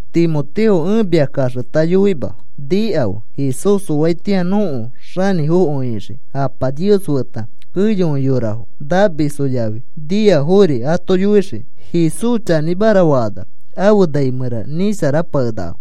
Timoteo, ẽ mia kaxeta yoima, nikafe. Jesús oatĩa nõko xanĩfokõi ixii Apa Nios feta, keyokõi yorafo namisfo yafi niafori ato yoixii. Jesús chanĩmara fakanax afe nai mẽra nisharapakenakafo;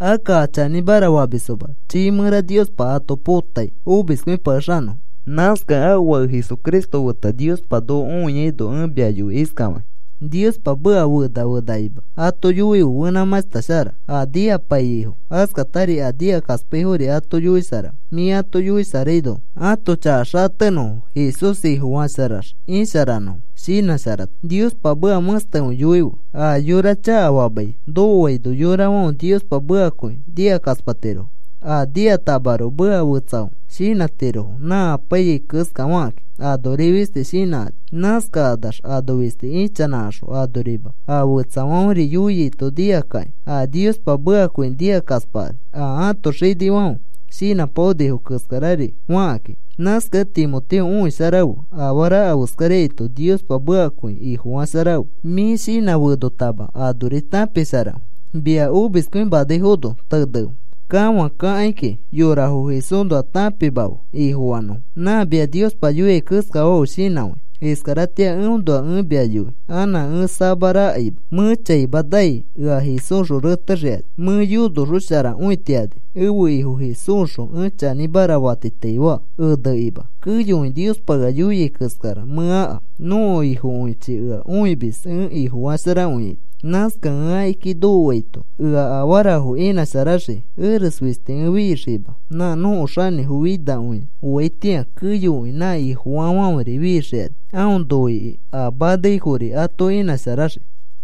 akka a chanĩmara famisfoma chiifã mẽra Niospa ato potai omiskõipakexanõfo. Nãskakẽ ãfe Fake Jesucristo feta Niospa noko õiaino ẽ mia yoi iskafakĩ: Niospa meka fena fenakima ato yoife fenãmãshta shara. A nikapaiyaifo askatari a nikakaspaifori ato yoisharafe, mĩ ato yoisharaino ãto chaka xatenõfo Jesús Ifofasharax isharanõfo. Shinãsharata, Niospa meka mẽstekõi yoife. A yora chakafamai nokoaino yorafãfe Niospa mekakõi nikakaspatirofo. A nikatamaroko meka fetsafo shinãtirofo, nã apaiyai keskafakakĩ. Anori fisti shinãkani. Nãskakanax ano fisti ichanãkaxõ anorima a fetsafãferi yoiaito nikakakĩ. A Niospa mekakõi nikakaspakani a ãto xinifãfe shinãpaonifo keskari fakakĩ. Nãskakẽ Timoteo, õisharafe. Afara afeskaraito Niospa mekakõi Ifofasharafe; mĩ shinãfenotama anori tãpisharafe. Mia omiskõimanaifono tenefe. Kafãkakaikĩ yorafo Jesúsnoa tãpimafe Ifofanõfo. Nã mia Niospa yoiai keskafafe shinãfãi. Iskaratĩa eõnoa ẽ mia yoi. Anã ẽ samarakaima mẽ chaima nai ea Jesúsxõ retexikani. Mẽ yonosharakõitiani ẽfe Ifo Jesúsxõ. Ẽ chanĩmara fatitaifaa enekima. Keyokõi Niospa ea yoiai keskara mẽ aka. Nõko Ifokõichi ea õimis ẽ Ifofasharakõiaito. Nãskakẽ ẽ akiki nokoaito ea afarafo inãsharaxii. Eres fisti ẽ fixiima. Nã nõko Xanĩfo finakõia oaitĩa keyokõi nã Ifofaafãferi fixikani. Aõ noikĩ a manaifori ato inãsharaxii.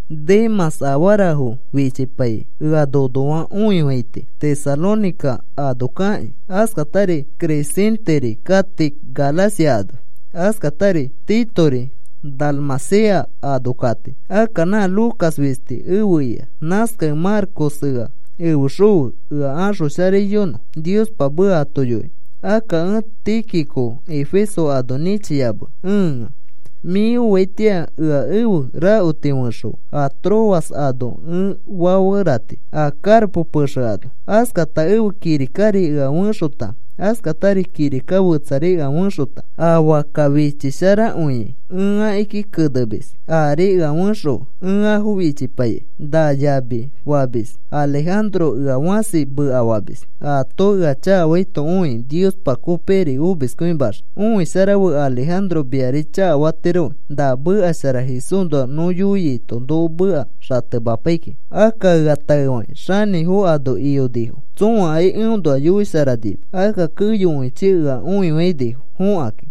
Demãs afarafo fichipaikĩ ea nonoa õifaiti, Tesalónica ano kakĩ. Askatari Crescenteri kati Galacia ano. Askatari Titori Dalmacia ano kati. Akka na Lucas fisti efe ika. Nãskakẽ Marcos ea efexõfe ea axosharaiyonõ Niospa meka ato yoikĩ. Akka ẽ Tíquico Efeso ano nĩchiyamea ẽa. Mĩ oaitĩa ea ẽfe rakoti fexõfe a Troas ano ẽ faferati a Carpo pexe ano. Askata ẽfe kirikari ea fẽxota, askatari kirika fetsari ea fẽxota a fakka fichisharakõi ẽ akiki kenemis, aari ea fexõfe. Ẽ afo fichipaikai. Na yami famis Alejandro ea fãsi mekafamis. Aato ea chakafaito õikĩ Niospa kopikiri omiskõimaxii. Õisharafe. Alejandro miari chakafatiroki na meka shara Jesúsnoa nõ yoiaito noko meka xatemapai kiki. Akka ea taefakĩ xanĩfo ano iyonifo tsõakai eõnoa yoisharanima. Akka keyokõichi ea õifainifo fõkakĩ.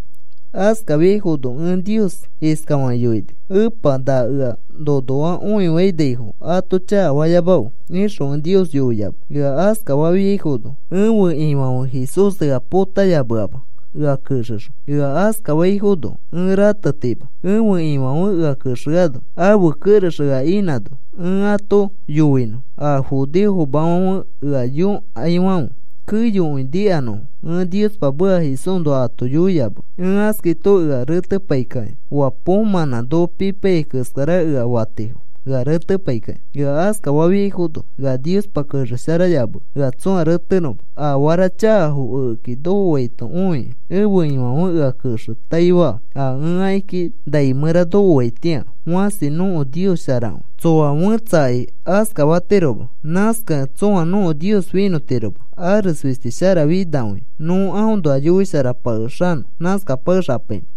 Askafiaifono ẽ Nios iskafakĩ yoini: “Epa, na ea nonoa õifainaifo ato chakafayamafe,” ixõ ẽ Nios yoiyamea. Ea askafafiaifono ẽfe Ifãfe Jesús ea potayameama, ea kexexõ. Ea askafaifono ẽ ratetima ẽfe Ifãfe ea kexeano ãfe kerex ea inãno ẽ ato yoinõ. A judeofomafãfe ea yõkaifãfe keyokõi nikanõfo ẽ Niospa meka Jesúsnoa ato yoiyamea. Ẽ askaito ea retepaikakĩ, oa poomãnã noko pipaiyai keskara ea fatifo ea retepaikakĩ. Ea askafafiaifono ea Niospa kexesharayamea ea tsõa retenõma. Afara chakafo ekeki nokoaito õikĩ ẽfe Ifãfe ea kexetaifa a ẽ akiki nai mẽra nokoaitĩa. Fãsi nõko Nios sharakõi, tsoa fẽtsakai askafatiroma. Nãskakẽ tsõa nõko Nios finõtiroma. Ares fisti sharafinakõia. Nõ aõnoa yoisharapakexanõ. Nãskapakexapainõ.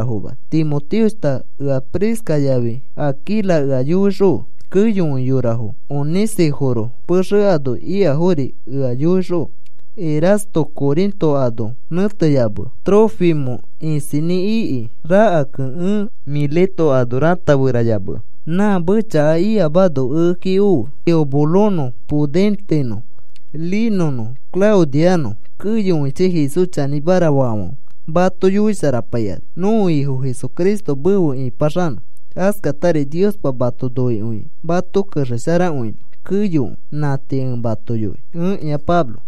Timoteoshta, ea Prisca yafi Aquila ea yoixõfe, keyokõi yorafo Onesíforo pexe ano ikafori ea yoixõfe. Erasto Corinto ano nẽteyamea. Trófimo isinĩ ikĩ rakakẽ ẽ Mileto ano rataferayamea. Nã mechaka ikamano ekeki ofe. Eubulonõ, Pudentenõ, Linõnõ, Claudianõ, keyokõichi Jesús chanĩmara faafãfe mato yoisharapaikani. Nõko Ifo Jesucristo mefe ipaxanõ. Askatari Niospa mato noikõikĩ mato kexesharakõinõ keyokõi. Nã tii ẽ mato yoi. Ẽkĩa Pablo